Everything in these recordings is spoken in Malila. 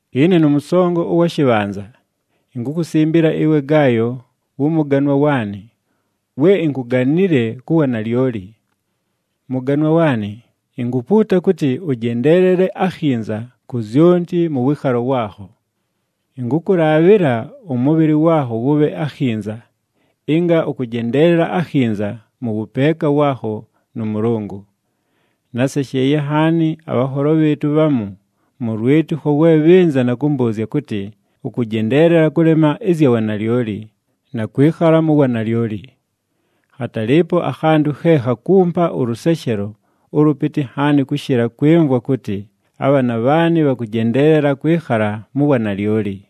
Ɨne nʉmʉsongo ʉwa shɨbhanza, inkukusimbila ɨwe Gaayo wʉ mʉganwa waanɨ, we inkuganile ku wanalyoli. Mʉganwa waanɨ, inkupuuta kʉtɨ ʉjendeelele akhinza ku zyonti mʉ wɨɨkhalo waakho. Ɨnkʉkʉlaabhɨla ʉmʉbhɨlɨ waakho wʉbhe akhinza, ɨnga ʉkʉjendeelela akhinza mʉ wʉpeeka waakho nʉ Mʉlʉngʉ. Násesheeye nhaani, abhanholo bhɨɨtʉ bhamu mʉ lwɨtɨkho we bhɨnza na kʉmbʉʉzya kʉtɨ ʉkʉjendeelela kʉlema ɨzya wanalyoli, na kwɨkhala mu wanalyoli. Khatalɨɨpo akhantʉ khe khakumpa ʉlʉseshelo ʉlʉpɨtɨ nhaani kʉshɨla kwɨmvwa kʉtɨ abhaana bhaanɨ bhakʉjendeelela kwɨkhala mu wanalyoli.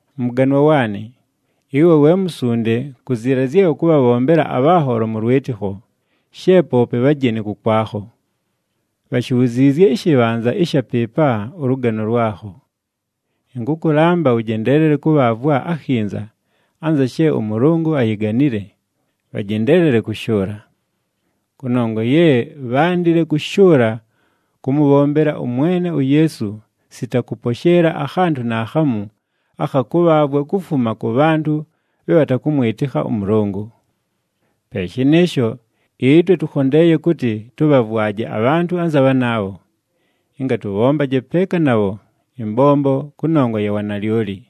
Mʉganwa waanɨ, ɨwe we musunde ku ziila zye ʉkʉbhabhombela abhanholo mʉ lwɨtɨkho, she poope bhajeni kʉkwakho. Bhashibhuziizye ɨshɨbhanza ɨsha pɨɨpa ʉlʉgano lwakho. Ɨnkʉkʉlamba, ʉjendeelele kʉbhaavwa akhinza anza she ʉMʉlʉngʉ ayiganile, bhajendeelele kʉshʉʉla. Kʉnongwa ye bhándile kʉshʉʉla kʉmʉbhombela ʉMwene uYeesu sita kʉposheela akhantʉ naakhamu akha kʉbhaavwa kufuma kʉ bhantʉ bhe bhatakʉmwɨtɨkha ʉMʉlʉngʉ. Pe shɨnɨɨsho, ɨtwe tʉkhondeeye kʉtɨ tʉbhavwaje abhantʉ anza bhanaabho, ɨnga tʉbhombaje peeka nabho ɨmbombo kʉnongwa ya wanalyoli.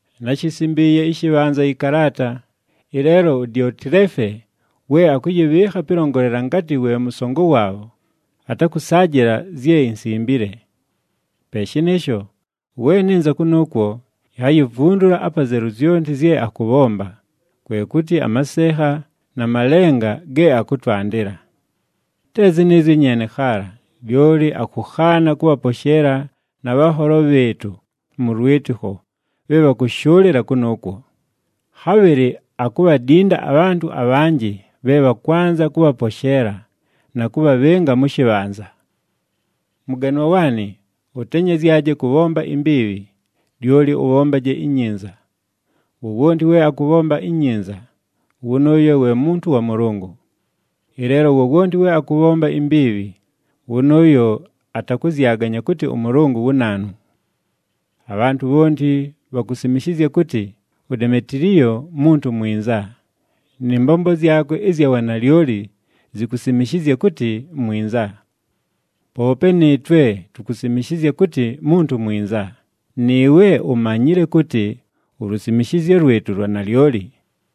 Náshisimbiiye ɨshɨbhanza ɨkalaata, ɨleelo uDiotileefe we akʉyɨbhɨɨkha pɨlongolela ngatɨ we mʉsongo waabho, atakʉsaajɨla zye insimbile. Pe shɨnɨɨsho, we nɨnza kʉnʉʉkwo, inhayivundula apazelu zyonti zye akʉbhomba, kwe kʉtɨ amasenha na malenga ge akʉtwandɨla. Te zɨnɨɨzyo nyeene khaala, lyoli akʉkhaana kʉbhaposheela na bhanholo bhɨɨtʉ mʉ lwɨtɨkho bhe bhakʉshʉʉlɨla kʉnʉʉkwo. Khabhɨlɨ akubhadinda abhantʉ abhanjɨ bhe bhakwanza kʉbhaposheela, na kʉbhabhɨnga mʉ shɨbhanza. Mʉganwa waanɨ, ʉtenyezyaje kʉbhomba imbiibhi, lyoli ʉbhombaje inyinza. Wowonti we akʉbhomba inyinza, wʉnʉʉyo we muntu wa Mʉlʉngʉ. Ɨleelo wowonti we akʉbhomba imbiibhi, wʉnʉʉyo atakʉzyaganya kʉtɨ ʉMʉlʉngʉ wu naanu. Abhantʉ bhonti bhakusimishizya kʉtɨ uDemetiliyo muntu mwinza, nɨ mbombo zyakwe ɨzya wanalyoli zikusimishizya kʉtɨ mwinza. Poope nɨɨtwe, tukusimishizya kʉtɨ muntu mwinza, nɨɨwe umanyile kʉtɨ ulusimishizyo lwɨtʉ lwa nalyoli.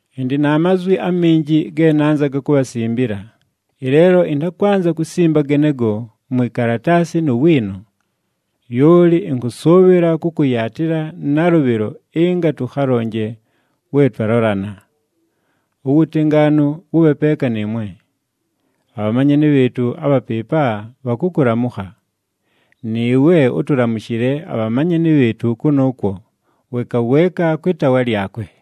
Ɨndɨ na mazwi aminji ge nanzaga kubhasimbila, ɨleelo ɨntakwanza kusimba genego mwi kalataasi nu wiino. Lyoli ɨnkʉsʉʉbhɨla kʉkʉyaatɨla nalʉbhɨlo ɨnga tʉkhalonje we twalolana. Uwutengaanu wʉbhe peeka nɨɨwe. Abhamanyani bhɨɨtʉ abha pɨɨpa bhakʉkʉlamʉkha. Nɨɨwe, ʉtʉlamʉshɨle abhamanyani bhɨɨtʉ kʉnʉʉkwo weeka weeka kwɨ taawa lyakwe.